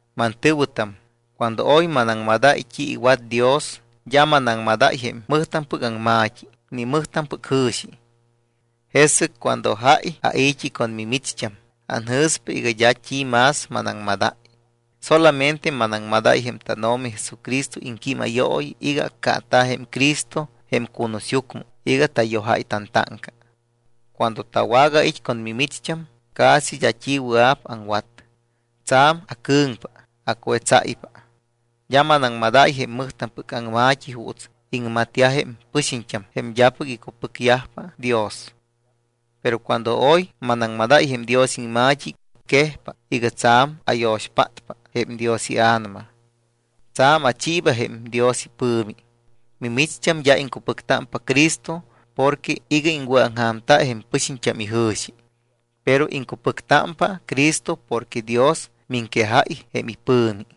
Mantɨ̱wɨtam, cuando oy manaŋmadáy t́i iwat Dios, d́a manaŋmadáy jém mɨjtampɨc aŋma̱t́i ni mɨjtampɨc jɨ̱xi. Jesɨc cuando jáy ai̱t́i con mimicht́am anjɨ̱spa iga d́a t́i más manaŋmadáy, solamente manaŋmadáy jém tánO̱mi Jesucristo iŋquímayooyi iga accaata̱ jém Cristo jém cunusyucmɨ iga tayojáy tantáŋca. Cuando tawagait́ con mimicht́am, casi d́a t́i wɨa̱p aŋwat. Tsa̱m acɨ̱ŋpa, acuetsáypa. D́a manaŋmadáy jém mɨjtampɨc aŋma̱t́i juuts iŋmatyajpa jém pɨxiñt́am jém d́apɨc icupɨcyajpa Dios. Pero cuando oy manaŋmadáy jém Dios iŋma̱t́i, quejpa iga tsa̱m ayo̱xpátpa jém Dios iA̱nama. Tsa̱m achiiba jém Dios ipɨ̱mi. Mimicht́am d́a iŋcupɨctámpa Cristo porque iga iŋwɨ̱aŋja̱mta jém pɨxiñt́am ijɨ̱xi, pero iŋcupɨctámpa Cristo porque Dios miŋquejáy jém ipɨ̱mi.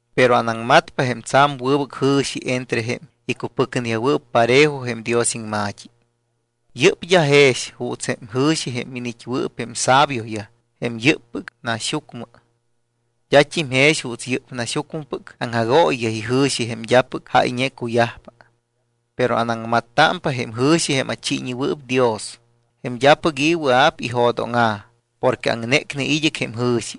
Pero anaŋmatpa jém tsa̱m wɨbɨc jɨ̱xi entre jém icupɨcneyajwɨɨp parejo jém Dios iŋma̱t́i. Yɨ́p d́a jex juuts jém jɨ̱xi jém iniit́wɨɨp jém sabioyaj jém yɨ́ppɨc naxyucmɨ. D́at́im jex juuts yɨ́p naxyucmɨpɨc aŋjagooyiyaj ijɨ̱xi jém d́apɨc jáyñe cuyajpa. Pero anaŋmattámpa jém jɨ̱xi jém achiiñewɨɨp Dios, jém d́apɨc i̱ wɨa̱p ijo̱dóŋa̱ porque aŋnécne id́ɨc jém jɨ̱xi.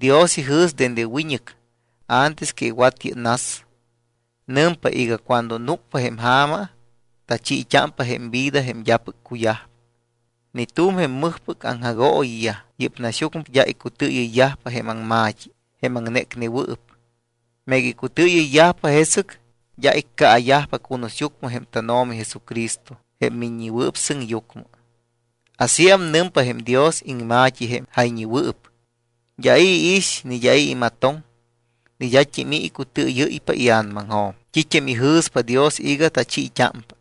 Dios ijɨ̱s dende wiñɨc antes que iwat yɨ́p nas. Nɨmpa iga cuando núcpa jém ja̱ma, tachiit́ámpa jém vida jém d́apɨc cuyajpa. Ni tu̱m jém mɨjpɨc aŋjagooyiyaj yɨ́p naxyucmɨ d́a icutɨɨyɨ́ypa jém aŋma̱t́i jém aŋnécnewɨɨp, meega icutɨɨyɨyyajpa, jesɨc d́a iccaayajpa cunusyucmɨ jém tánO̱mi Jesucristo jém Miññewɨɨp Sɨŋyucmɨ. Asíam nɨmpa jém Dios iŋma̱t́i jém jayñewɨɨp: D́a i̱ iix, ni d́a i̱ imatoŋ, ni d́at́im i̱ icutɨɨyɨ́ypa ia̱namaŋjo̱m t́it́am ijɨ̱spa Dios iga tachiit́ámpa.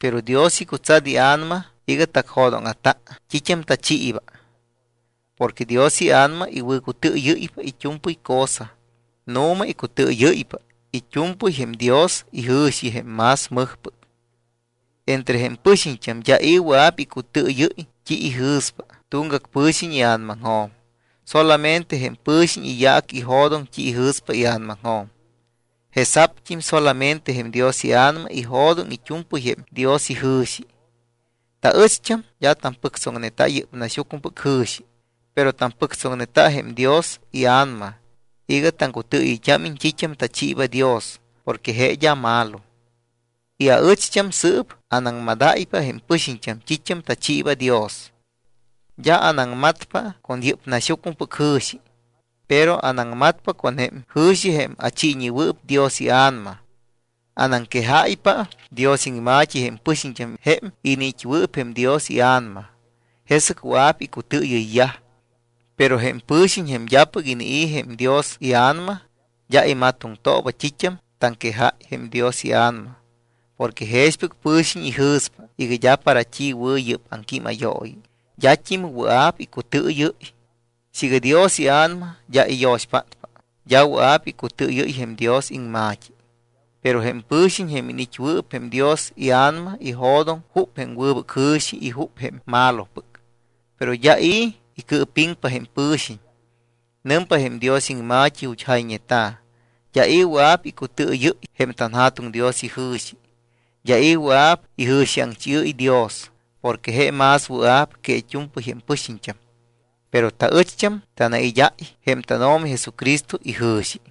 Pero Dios icutsat iA̱nama iga tacjo̱dóŋa̱ta t́it́am tachiiba. Porque Dios iA̱nama iwɨ̱cutɨɨyɨ́ypa it́u̱mpɨy cosa. Nu̱ma icutɨɨyɨ́ypa it́u̱mpɨy jém Dios ijɨ̱xi jém más mɨjpɨc. Entre jém pɨxiñt́am d́a i̱ wɨa̱p icutɨɨyɨ́y t́i ijɨ̱spa tuŋgac pɨ̱xiñ ia̱namaŋjo̱m, solamente jém pɨ̱xiñ iyaac ijo̱doŋ t́i ijɨ̱spa ia̱namaŋjo̱m. Jesa̱pt́im solamente jém Dios iA̱nama ijo̱doŋ it́u̱mpɨy jém Dios ijɨ̱xi. Taɨcht́am d́a tampɨctsoŋneta yɨ́p naxyucmɨpɨc jɨ̱xi, pero tampɨctsoŋneta jém Dios iA̱nama iga taŋcutɨɨyɨyt́ámiñ t́it́am tachiiba Dios porque je d́a malo. Y aɨcht́am sɨɨp anaŋmadáypa jém pɨxiñt́am t́it́am tachiiba Dios. D́a anaŋmatpa con yɨ́p naxyucmɨpɨc jɨ̱xi, pero anaŋmatpa con jém jɨ̱xi jém achiiñewɨɨp Dios iA̱nama. Anaŋquejáypa Dios iŋma̱t́i jém pɨxiñt́am jém iniit́wɨɨp jém Dios iA̱nama, jesɨc wɨa̱p icutɨɨyɨyyaj. Pero jém pɨ̱xiñ jém d́apɨc inii̱ jém Dios iA̱nama d́a imatoŋtooba t́it́am taŋquejáy jém Dios iA̱nama porque jexpɨc pɨ̱xiñ ijɨ̱spa iga d́a para t́i wɨ̱ yɨ́p aŋquímayooyi, d́at́im wɨa̱p icutɨɨyɨ́y. Siiga Dios iA̱nama d́a iyo̱xpátpa, d́a wɨa̱p icutɨɨyɨ́y jém Dios iŋma̱t́i. Pero jém pɨ̱xiñ jém iniit́wɨɨp jém Dios iA̱nama ijo̱doŋ jup jém wɨbɨc jɨ̱xi y jup jém malopɨc. Pero d́a i̱ icɨɨpiŋpa jém pɨ̱xiñ. Nɨmpa jém Dios iŋma̱t́i ju̱t́ jayñeta̱: “D́a i̱ wɨa̱p icutɨɨyɨ́y jém tanJa̱tuŋ Dios ijɨ̱xi. D́a i̱ wɨa̱p ijɨ̱xiaŋchiɨ́y Dios porque je más wɨa̱p que it́u̱mpɨy jém pɨxiñt́am.” Pero taɨcht́am tanaid́áy jém tánO̱mi Jesucristo ijɨ̱xi.